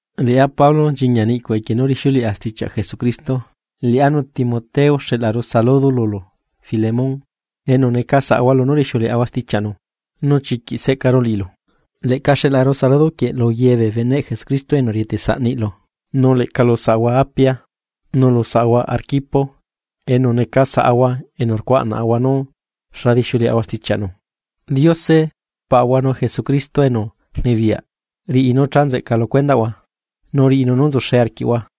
Liꞌá Pablo, nchiñia niꞌcuꞌ equie nú rixiuleꞌa stichiaꞌ Jesucristo, liꞌá nu Timoteo xeꞌlaru saludo lulu Filemón enu neca saꞌahua lunú rixiuleaꞌahua stichiaꞌnu, nu chiquiꞌ seꞌcaru liꞌilu, leꞌca xeꞌlaru saludo quieꞌ lu ye bee beneꞌ Jesucristo enu rieteꞌ saꞌ niꞌlu, nu leꞌca lu saꞌahua Apia, nu lu saꞌahua Arquipo enu neca saꞌahua enu rcuaꞌnaꞌahua nú xa dixiuleꞌahua stichiaꞌnu. Diose Paꞌahua nu Jesucristo enu rnibiyaꞌ riꞌi nú cha nzeꞌca lu cuendaꞌhua, nu riꞌinu nú nzuxe arquiꞌhua.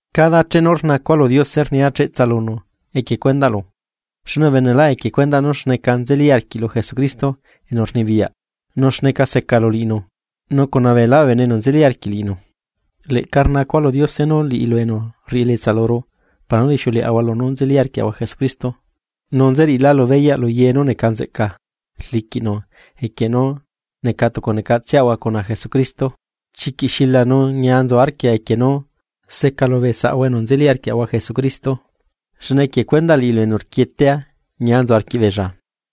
Cada chenu rnacua lu Diose rnia cheꞌtsa lunu equie cuendaꞌlu, xne ubenelá equie cuendaꞌ nú xneca nzeli arquiꞌlu Jesucristo enu rnibiyaꞌ nu xneca secalu liꞌinu nu cuna beelá bee bene enu nzeli arquiꞌ liꞌinu. Leꞌca rnacua lu Diose nú liꞌilu enu rriꞌi elietsa luru para nú rixiuleaꞌahua lunú nzeli arquiaꞌahua Jesucristo, nu nzeriꞌilálu beyaꞌ lu ye nú neca nzeꞌca rliquiꞌnu equie nú neca tucu necatseꞌahua cuna Jesucristo. Chiquiꞌ xila nu ñia nzu arquia equie nú secalu bee saꞌahua enu nzeli arquiaꞌahua Jesucristo, xne equie cuendaꞌ liꞌilu enu rquietea, ñia nzu arquiꞌbeella.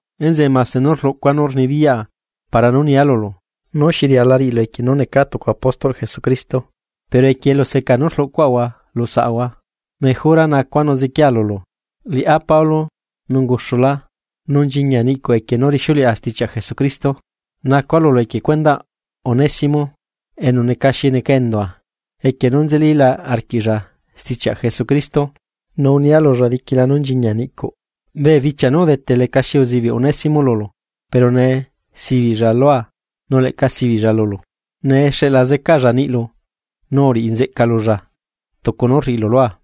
Enzeꞌe mase nú rluꞌcua nú rnibiyaꞌa para nú nia lulu nú xi riala riꞌilu equie nú necaa tucu apóstolꞌ Jesucristo, pero equie eluseca nú rluꞌcuaꞌahua lu saꞌahua, mejora nacua nu ziquiea lulu, liꞌá Pablo nu unguxulá, nu nchiñia niꞌcuꞌ equie nú rixiuleꞌa stichiaꞌ Jesucristo, nacua lulu equie cuendaꞌ Onésimo, enu neca xi neca endua equie nú nzelila arquiꞌlla stichiaꞌ Jesucristo, nu unia lulla diquila nú nchiñia niꞌcuꞌ. Bee bichia nú udete lecaxi uzibiꞌ Onésimo lulu, pero ne sibiꞌlla lua nu leꞌca sibiꞌlla lulu. Nee xeꞌla zecaalla niꞌlu, nu uriꞌi nzeꞌca lulla, tucu nú rriꞌilu lua.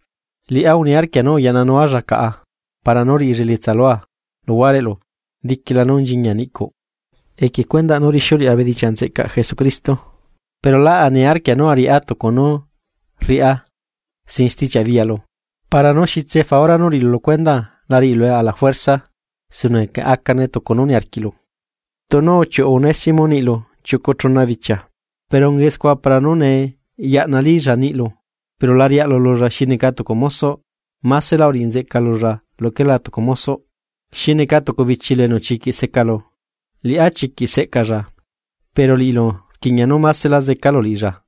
Liꞌá uniarquia nú ayaꞌnanualla caꞌa para nú riꞌilla elietsa lua luhuareꞌlu diquila nú nchiñia niꞌcuꞌ, equie cuendaꞌ nú rixiuleꞌa bedichiaꞌ nzeꞌcaꞌ Jesucristo. Pero lá aniarquia nú ariꞌá tucu nú riꞌá sin stichiaꞌ biyaꞌlu para nú xitse faura nú riꞌilu lu cuendaa la riꞌilue ala juerza, sino que acane tucu nú niarquiꞌlu. Tunu uchiuꞌu Onésimo niꞌlu chiucu chuna bichia, pero ungae scua para nú nee yaꞌna lilla niꞌlu. Pero la riaꞌlu lulla xi neca tucu mosoꞌ, másela uriꞌi nzeꞌca lulla luquela tucu mosoꞌ, xi neca tucu bichilu enu chiquiꞌ secalu. Liꞌá chiquiꞌ seꞌcalla, pero liꞌilu rquiꞌña nú másela zecalu liꞌilla,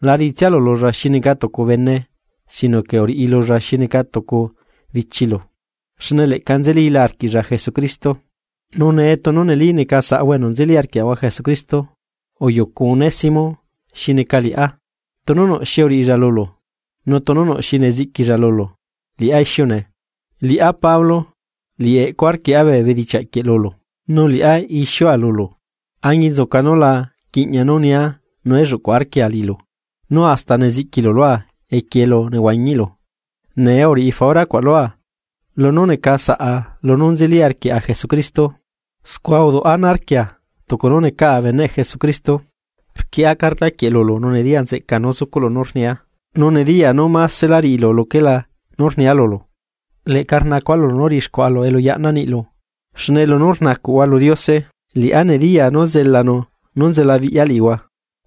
la riꞌitsialu lulla xi neca lu tucu bene sino que uriꞌi lulla xi neca tucu bichilu, xne leꞌca nzelila arquiꞌlla Jesucristo. Nu ne tunu neli neca saꞌahua enu nzeli arquiaꞌahua Jesucristo, uyucu Onésimo xi neca liꞌá. Tunu nuꞌ xi uriꞌilla lulu, nu tunu nuꞌ xi neziꞌquilla lulu, liꞌá ixiune. Liꞌá Pablo, liꞌi eꞌcua rquieꞌa bee bedichiaꞌ quieꞌ lulu, nú liꞌá ixiua lulu, añinzuca nú la quiꞌña nú nia nu elluꞌcu arquia liꞌilu nú hasta neziꞌquilu lua equie elu nehuañiꞌlu. Ne uriꞌi faura cuaꞌ lua, lunú neca saꞌa lunú nzeli arquiaꞌa Jesucristo: Scua uduꞌ ana arquia tucu nú necaꞌa beneꞌ Jesucristo. Rquieꞌa carta quieꞌ lulu nu nediya nzeꞌcaa nú zucuꞌlu nú rnia, nu nediyaa nú másela riꞌilu luquelá nú rnia lulu. Leꞌca nacua lulu nú riꞌixcuaꞌalu elu yaꞌnaa niꞌlu, xne lunú rnacuꞌhua lu Diose, liꞌá nediyaa nú zelanu nú nzelaabiꞌya liꞌihua.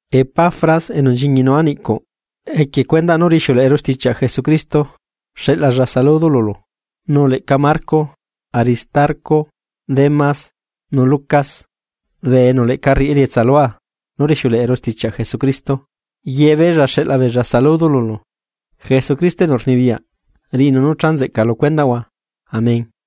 Epafras enu nchiñinua niꞌcuꞌ equie cuendaꞌ nú rixiuleꞌeru stichiaꞌ Jesucristo, xeꞌlalla saludo lulu, nu leꞌca Marco, Aristarco, Démas nu Lucas, bee enu leꞌca rriꞌi elietsa lua nú rixiuleꞌeru stichiaꞌ Jesucristo, yebeella xeꞌla beella saludo lulu. Jesucristo enu rnibiyaꞌ riꞌinu nú cha nzeꞌca lu cuendaꞌhua. Amén.